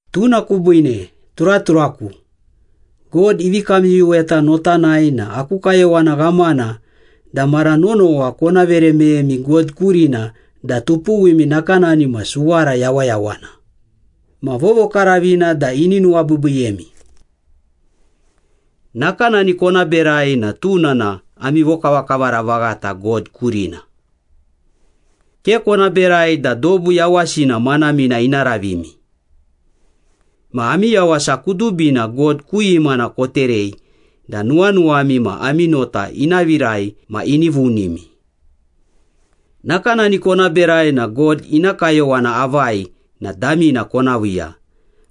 Tuna kubiine, turaturaku, God ivi kamyuyuweta notanai na aku kayowana ghamana da mara nonowa kona vere meyemi God kurina da tami nakanani ma suwara yawayawana ma vovokaravina da ini nuwabiibiiyemi. Nakanani kona berai na tuna na ami vokavakavara vaghata God kurina. Ke kona berai da dobu yawasina manamina ina ravimi. Ma ami yawasa kudubina God ku imana koterei da nuwanuwami ma ami nota ina virai ma ini vunimi. Nakanani kona berai na God ina kayowana avai na damina kona viiya,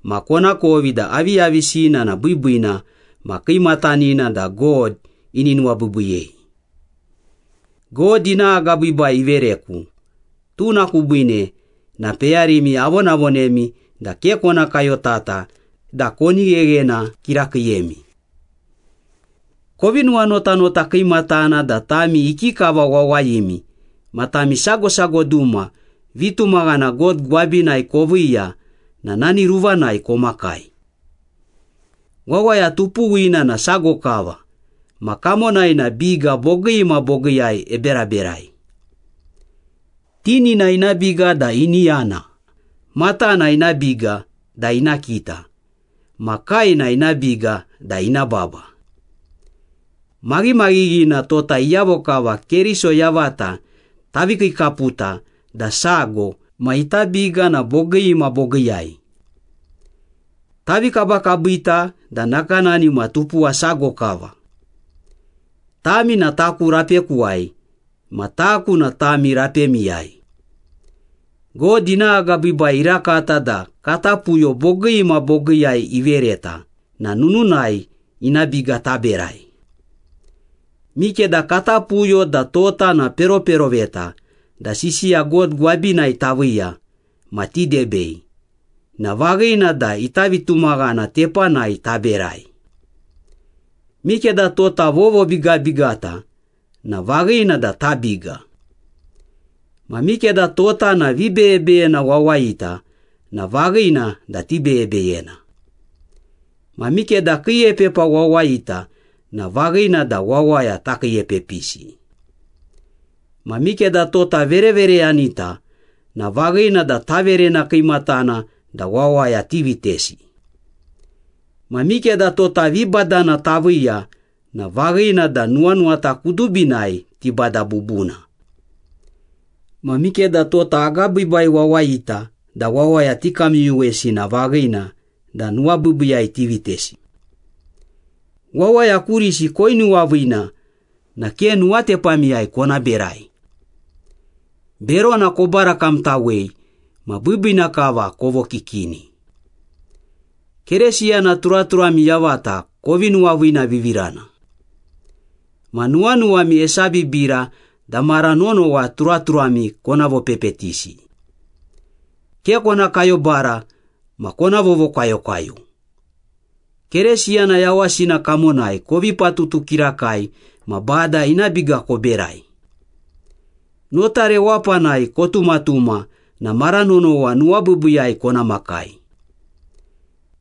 ma konakovi da aviyavisina na biibiina ma kiimatanina da God ini nuwabiibiiyei. God ina agabiibai ivereku, tuna kubiine na peyarimi avonavonemi da ke kona kayotata da koni gheghena kirakiiyemi. Kovi nuwanotanota kiimatana da tami ikikava wawayimi ma tami sago sago duma vitumaghana God gwabinai koviiya na nani ruvanai komakai. Wawaya tupuwina na sago kava ma kamonai na biga bogii ma bogiiyai eberaberai. (Tinina ina biga da ini yana, matana ina biga da ina kita, ma kaena ina biga da ina baba.) Maghimaghighina tota iyavo kava Keriso yavata tavi kiikaputa da sago ma ita biga na bogii ma bogiiyai. Tavi kabakabita da nakanani ma tupuwa sago kava. Tami na taku rapekuwai ma taku na tami rapemiyai. God ina agabiibai irakata da kata puyo bogii ma bogiiyai ivereta na nununai ina biga taberai. Mikeda kata puyo da tota na peroperoveta da sisiya God gwabinai taviiya ma tidebei, na vaghina da ita vitumaghana tepanai taberai. Mikeda tota vovobigabigata na vaghina da tabiga. Ma mikeda tota na vibeyebeyena wawayita na vaghina da tibeyebeyena. Ma mikeda kiiepepa wawayita na vaghina da wawaya takiiepepisi. Ma mikeda tota verevereyanita na vaghina da taverena kiimatana da wawaya tivitesi. Ma mikeda tota vibadana taviiya na vaghina da nuwanuwata kudubinai tibada bubuna. Ma mikeda tota agabiibai wawayita da wawaya tikamyuyuwesi na vaghina da nuwabiibiiyai tivitesi. Wawaya kurisi koinuwaviina na ke nuwatepamiyai kona berai. Berona kobarakamtawei ma biibiina kava kovokikini. Keresiyana turaturami yavata kovi nuwaviinavivirana. Ma nuwanuwami esabibira da mara nonowa turaturami kona vopepetisi. Ke kona kayobara ma kona vovokwayokwayo. Keresiyana yawasina kamonai kovi patutu kirakai ma Bada ina biga koberai. Nota rewapanai kotumatuma na mara nonowa nuwabiibiiyai kona makai.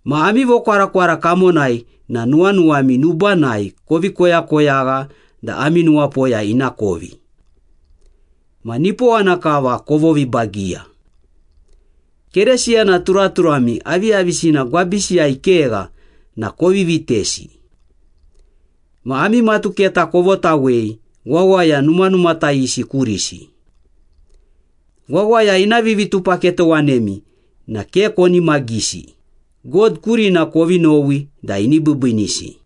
Ma ami vokwarakwara kamonai na nuwanuwami nubanai kovi koyakoyagha da ami nuwapoya ina kovi. Ma nipowana kava kovovibagiya. Keresiyana turaturami aviyavisina gwabisiyai kegha na kovi vitesi. Ma ami matuketa kovotawei wawaya numanumatayisi kurisi. Wawaya ina vivitupaketowanemi na ke konimagisi, God kurina kovi nowi da ini biibiinisi.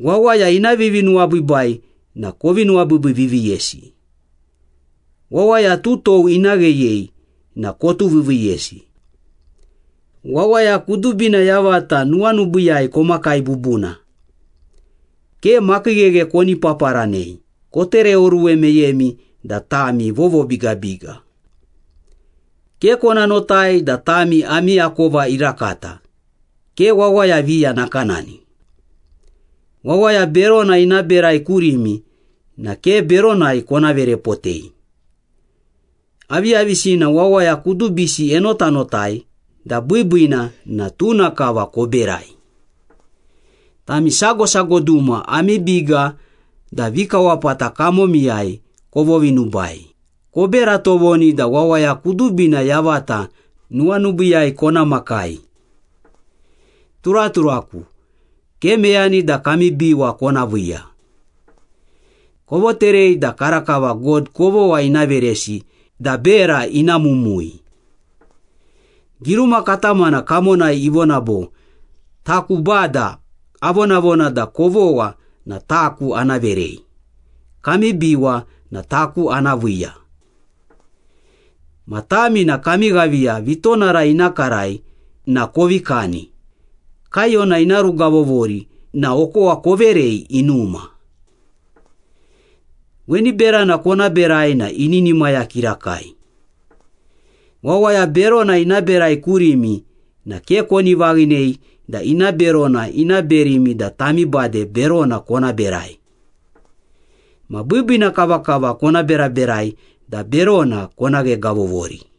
Wawaya ina vivinuwabiibai na kovi nuwabiibiiviiviiyesi. Wawaya tutou ina gheyei na kotuviiviiyesi. Wawaya kudubina yavata nuwanubiiyai komakai bubuna. Ke makiigheghae koni paparanei, kotereoruwe meyemi da tami vovobigabiga. Ke kona notai da tami ami akova irakata, ke wawaya viya nakanani. Wawaya berona ina berai kurimi na ke beronai kona verepotei. Aviyavisina wawaya kudubisi enotanotai da biibiina na tuna kava koberai. Tami sago sago duma ami biga da vikawapata kamomiyai kovovinubai, kobera tovoni da wawaya kudubina yavata nuwanubiiyai kona makai. Turaturaku, ke meyani da kami biwa kona viiya. Kovoterei da karakava God kovogha ina veresi da bera ina mumui. Giruma katamana kamonai ivona bo, “Taku Bada avonavona da kovogha na taku ana verei, kami biwa na taku ana viiya.” Ma tami na “kami ghaviya vitonara ina karai na kovi kani, kaiyona ina rugavovori na okowa koverei inuma. Weni berana kona berai na ininimaya kirakai.” Wawaya berona ina berai kurimi na ke koni vaghinei da ina berona ina berimi da tami bade berona kona berai. Ma biibiina kavakava kona beraberai da berona kona ghegavovori.